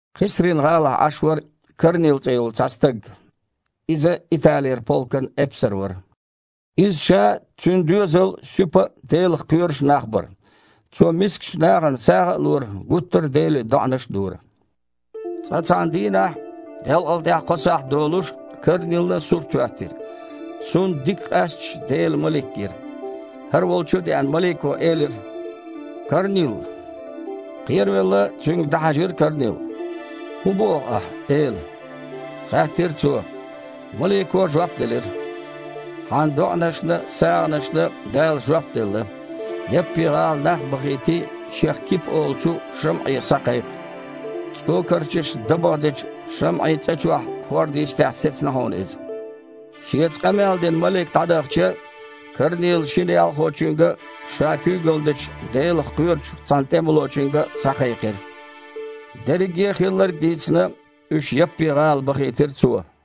Кхесрин-гІалахь Іаш вара Корнил цІе йолу цхьа стаг. Иза Италера полкан эпсар вара. Иза ша а, цуьнан доьзал а суьпа а, Делах кхоьруш а нах бара. Цо мискачу нахана сагІа а лора, гуттар а Деле доІанаш а дора. Цкъа цхьана дийнахь делкъал тІаьхьа кхо сахьт долуш Корнилна сурт хІоьттира. Цунна дика къаьсташ Делан малик гира. ХІара волчу а деана, малико элира: «Корнил!» Кхеравелла, цуьнга дІахьаьжира Корнил. «ХІун боху ахьа, Эла?» – хаьттира цо. Малико жоп делира: «Хьан доІанашна а, сагІанашна а Дала жоп делла. Яппи-гІала нах а бахийтий, шех Кипа олучу ШамІе схьакхайкха. ЦІокарчашна дабагІа дечу ШамІин цІа чохь, хІорда йистехь сецна хьуна иза». Шеца къамел дина малик дІадахча, Корнила шина ялхочуьнга а, ша куьйгалла дечу, Делах кхоьручу цхьана тІемалочуьнга а схьакхайкхира. Дерриге а хилларг а дийцина, уьш Яппи-гІала бахийтира цо.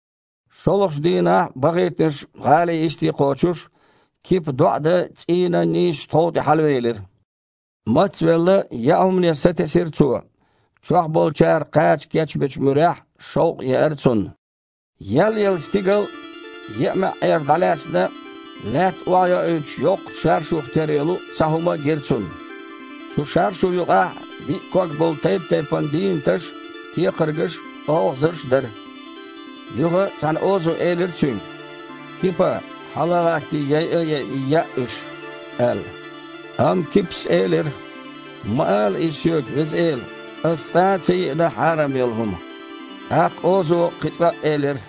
ШолгІачу дийнахь бахийтинарш гІалин йисте кхочуш, Кипа доІа дан цІийнан нийсачу тхов тІе хьалавелира. Мац а велла, яа хІумане сатесира цо. Чохь болчара кхача кечбечу муьрехь шовкъ еара цунна. Еллаелла стигал а, еа маьІІера дІалаьцна, лаьтта охьайоуьйтуш йоккхачу шаршух тера йолу цхьа хІума а гира цунна. Цу шаршу юкъахь биъ ког болу тайп-тайпана дийнаташ а, текхаргаш а, олхазарш а дара. Юха цхьана озо элира цуьнга: «Кипа, хьала а гІаттий, яйа а яйий, яа уьш», – аьлла. Амма Кипас элира: «Ма ала иза соьга, Веза Эла! Ас цкъа а ца йиъна хьарам йолу хІума». ТІаккха озо кхин цкъа а элира: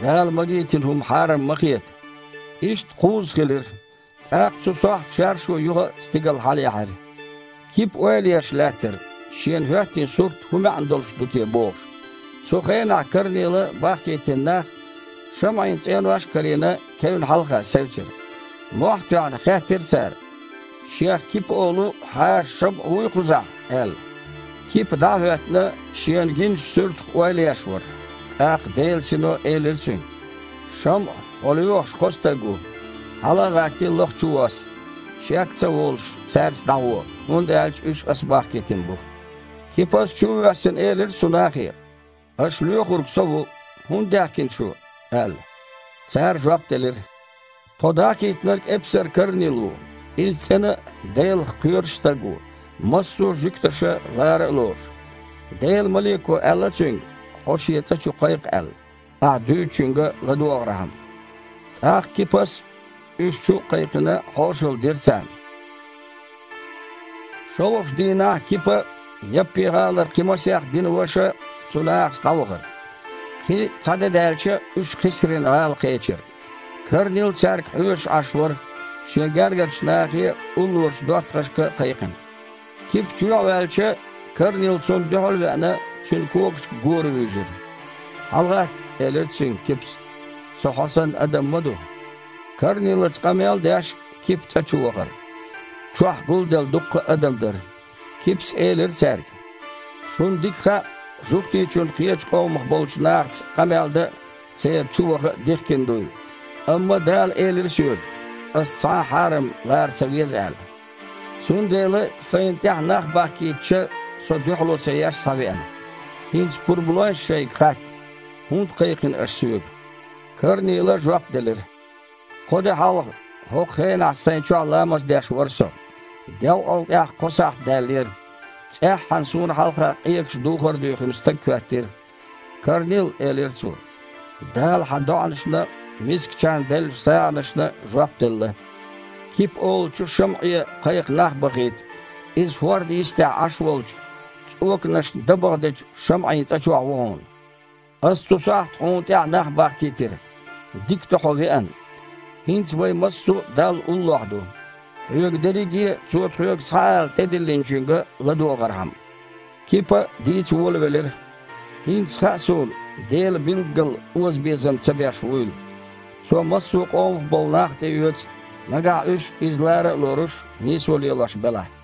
«Дала магийтина хІума хьарам ма хета». Иштта кхузза хилира, тІаккха цу сохьта шаршу юха а стигала хьалаяьхьира. Кипа ойла еш лаьттара, шена хІоьттина сурт хІун маьІна долуш ду те бохуш. Цу хенахь Корнила бахкийтина нах, ШамІин цІенош а карийна, кевнна хьалха севцира. Мохь а тоьхна, хаьттира цара: «Шех Кипа олу хьаша ШамІа вуй кхузахь?» – аьлла. Кипа, дІа а хІоьттина, шена гиначу суьртах ойла еш вара. ТІаккха Делан Сино элира цуьнга: «ШамІа, хьо лоьхуш кхо стаг ву. Хьала а гІаттий, лаха чувосса. Шек а ца волуш, цаьрца дІагІо, хІунда аьлча уьш Ас бахкийтина бу». Кипас, чу а воьссина, элира цу нахе: «Аша лоьхург со ву. ХІунда даьхкина шу?» – аьлла. Цара жоп делира: «Тхо дахкийтинарг эпсар Корнил ву. Иза цІена а, Делах кхоьруш а стаг ву, массо а жуьгташа лара а лоруш. Делан малико аьлла цуьнга, хьо шен цІа чу кхайкха аьлла, ахьа дуьйцучуьнга ладогІархьама». ТІаккха Кипас, уьш чу а кхайкхина, хьошалла дира царна. ШолгІачу дийнахь Кипа а, Яппи-гІалара кхин масех динан ваша а цу нахаца дІавахара. Кхин цхьа де даьлча, уьш Кхесрин-гІала кхечира. Корнил цаьрга хьоьжуш Іаш вара, шен гергарчу нахе а, уллорачу доттагІашка а кхайкхина. Кипа чоьхьа ваьлча, Корнил, цунна дуьхьал а веана, цуьнан когашка гора вуьйжира. «ХьалагІатта, – элира цуьнга Кипас, – со хьо санна адам ма ду». Корнилаца къамел а деш, Кипа цІа чу вахара. Чохь гулделла дуккха а адам дара. Кипас элира цаьрга: «Шуна дика хаьа, жуьгтичунна кхечу къомах болчу нахаца къамел дан а, церан чу ваха а дихкина дуйла. Амма Дала элира соьга, ас цхьа а хьарам лара ца веза аьлла. Цундела сайна тІаьхьа нах бахкийтича, со, дуьхьало ца еш, схьавеана. ХІинца пурба лойша шайга хатта: хІунда кхайкхина аша соьга?» Корнила жоп делира: «Кхо де хьалха хІокху хенахь сайн чохь ламаз деш вара со, делкъал тІаьхьа кхо сахьт даьллера. ЦІеххьана суна хьалха къегаш духар а дуьйхина стаг хІоьттира. „Корнил, – элира цо, – Дала хьан доІанашна а, мискачарна деллачу сагІанашна а жоп делла. Кипа олучу ШамІе кхайкха нах бахийта. Иза хІорда йистехь Іаш волчу цІоканашна дабагІа дечу ШамІин цІа чохь ву хьуна“. Ас цу сохьта хьуна тІаьхьа нах бахкийтира. Дика ду хьо веана. ХІинца вай массо а Далла уллохь ду, хьоьга дерриге а Цо тхоьга схьаала тІедиллинчуьнга ладогІархьама». Кипа дийца волавелира: «ХІинца хаьа суна Дела билггала озабезам ца беш вуйла. Цо массо а къомах болу нах тІеоьцу, нагахь уьш Иза лара а лоруш, нийсо лелош белахь!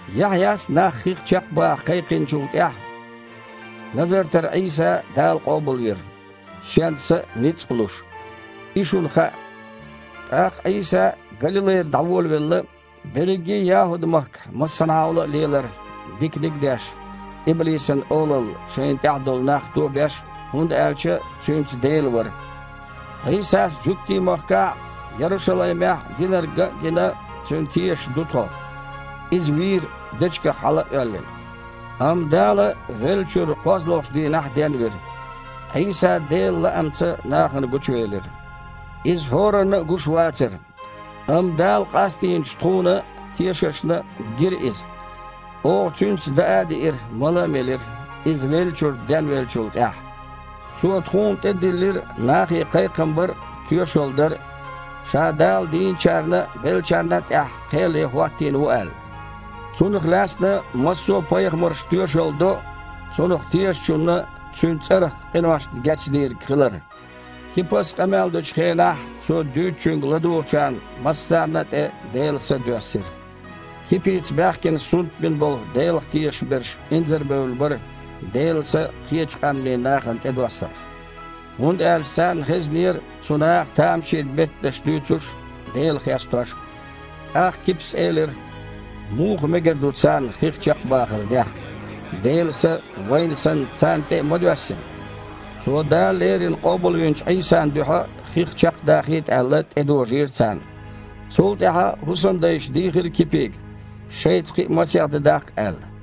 Яхьъяс нах хих чекхбаха кхайкхинчул тІаьхьа Назартара Іийса Дала къобалвира, Шен Са а, ницкъ а луш. И шуна хаьа. ТІаккха Іийса Галилайра дІаволавелла, берриге а ЯхІуд-махкахь массанхьахула лелара, диканиг деш а, иблисан олалла шайна тІехь долу нах тобеш а, хІунда аьлча Цуьнца Дела вара. Іийсас жуьгтийн махкахь а, Ярушалаймехь а динарг ган а гина, цуьнан тешаш ду тхо. Иза вийра, дечигах хьала а оьллина, амма Дала веллачуьра кхозлагІчу дийнахь денвира. Іийса Делан лаамца нахана гучувелира. Иза хІоранна а гуш вацара, амма Дала къастийначу тхуна, тешашна, гира Иза. Оха Цуьнца даа а диира, мала а мелира Иза веллачуьра денвеллачул тІаьхьа. Цо тхуна тІедиллира нахе кхайкхам бар а, тоьшалла дар а, Ша Дала дийначарна а, беллачарна а тІехь кхел ян хІоттийна ву аьлла. Цунах лаьцна массо а пайхамарша тоьшалла до Цунах тешачунна Цуьнан цІарах къиношна гечдийриг хилар». Кипас къамел дечу хенахь цо дуьйцучуьнга ладугІучарна массарна а тІе Делан Са доьссира. Кипица баьхкина сунтбина болу Делах тешаш берш инзарабевлла бара Делан Са кхечу къаьмнийн нахана тІедоссарх, хІунда аьлча царна хезнера цу наха тамашийна меттанаш дуьйцуш а, Дела хестош а. ТІаккха Кипас элира: «Муха мегар ду царна хих чекхбахар дехка? Делан Са, вайна санна, царна тІе а ма доьссина!» Цо Дала леррина къобалвинчу Іийсан дуьхьа хих чекхдахийта аьлла, тІедожийра царна. Цул тІаьхьа хІусамдайша дийхира Кипига, шайца кхин а масех де даккха аьлла.